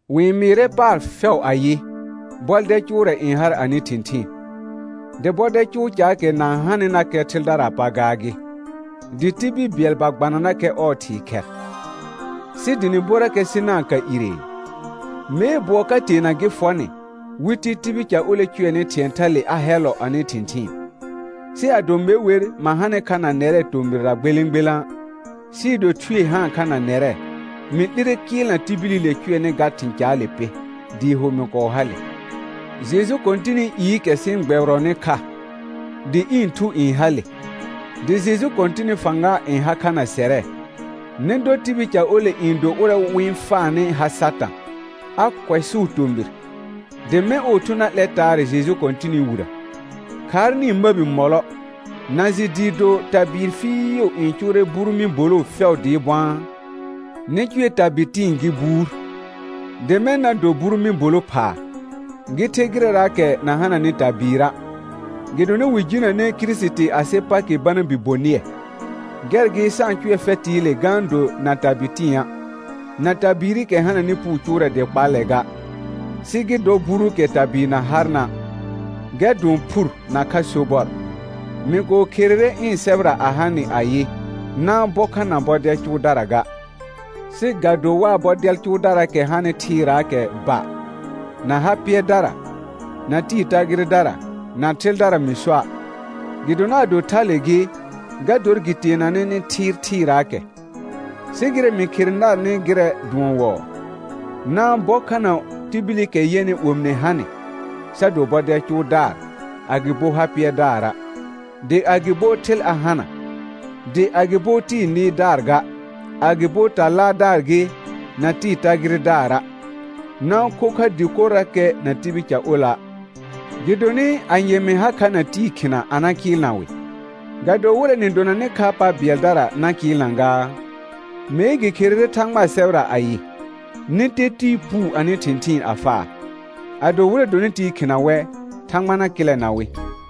Wɩ-n mɩɩrɛ paar fɛʋ ayɩ, bɔdɛl cʋʋrɛ n har anɩ thɩ̃thɩɩn, dɩ bɔdɛl cʋʋ caakɛ na-n hanɩnakɛ thɩldaraa pa gaa gɩ, dɩ tibil bɩɛl ba gbananakɛ ɔɔ thɩɩ khɛr. Sɩ dɩ nɩ borakɛ sɩ na ka iree. Mee bʋɔ ka teena gɩ fɔ nɩ, wɩ ti tibil ca ole cʋɛnɩ thɩ̃ɛ thale a hɛllɔ anɩ thɩ̃thɩɩn. Sɩ ado me wer ma hanɩ kha na nɛrɛ tomɩrra gbelẽ gbelã', sɩɩ do thue haan kha na nɛrɛ, mɩ 'lire kɩɩlna tibilile cʋɛnɩ ga thɩ̃ caale pɩ, dɩɩ ho mɩ kɔɔ hale. Jeju Kɔ̃tɩnɩ iikɛ sɩ-n gbɛbɩrɔnɩ kha, dɩ ɩ̃ thu n hale, dɩ Jeju Kɔ̃tɩnɩ fãga n ha kha na sɛrɛ, nɩ dɔ tibil ca ole n do ʋrɛ wɩ-n faanɩ ha Satã, a kʋɛsʋʋ tomɩr, dɩ mɛ̃ ɔɔ thu na 'lɛ taarɛ Jeju Kɔ̃tɩnɩ wirə. Khaar nɩ-n məbi mɔlɔ; na jɩ dɩɩ do tabɩɩr fɩɩʋ n cʋʋrɛ buru mɩ̃ boloo fɛʋ dɩɩ bʋ̃aa? Nɩ cʋɛ tabɩ tɩ̃ɩ gɩ buur, dɩ mɛ̃ na do buru mɩ̃ bolo phaa, gɩ the gɩrɛraakɛ na hananɩ tabɩɩra'; gɩdonɩ wɩ jinəne Kirisiti asɩ Pakɩ bana bi bonɩɛ. Gɛr gɩ sa-n cʋɛ fɛtɩɩle ga-n do na tabɩ tɩ̃a', na tabɩɩrɩkɛ hananɩ puu cʋʋrɛ dɩ kpallɛ ga, sɩ gɩ dɔ buruukɛ tabɩɩr na harna', gɛr dʋɔn phur nakha sobɔr. Mɩ kɔɔ kherere ɩ̃ sɛbɛra a ha nɩ ayɩ: Na-n bɔ kha na bɔdɛl cʋʋdara ga. Sɩ ga do waa bɔdɛl cʋʋdaraakɛ hanɩ thɩɩraakɛ ba, na ha pɩɛrdara, na tɩɩ tagɩrɩdara, na thɩldara mɩ soa', gɩdonɩ ado thale gɩ, ga dor gɩ teenanɛ nɩ thɩɩr thɩɩraakɛ. Sɩ gɩrɛ mɩ khere narnɩ gɩrɛ dʋɔn wɔɔ: Na-n bɔ kha na tibilikɛ yɛnɩ omine ha nɩ, sa do bɔdɛl cʋʋdaar, agɩbo ha pɩɛrdaara', dɩ agɩbo thɩl a hana, dɩ agɩbo tɩɩ nɩɩrdaar ga, agɩbo ta laardaar gɩ, na tɩɩ tagɩrɩdaara'; na-n kho kha dɩkorrakɛ na tibil ca ola'. Gɩdonɩ anye mɩ ha kha na tɩɩ khɩna a na kɩɩlna wɩ? Ga do wɩrɛ nɩ donanɩ kha pa bɩɛldara na kɩɩlna gaa? Mee gɩ kherere Thãgbaa sɛbɛra ayɩ: «Nɩ te tɩɩ puu anɩ thɩ̃thɩɩn a faa.» Ado wɩrɛ dɔnɩ tɩɩ khɩna wɛ, Thãgba na kɩlɛna wɩ.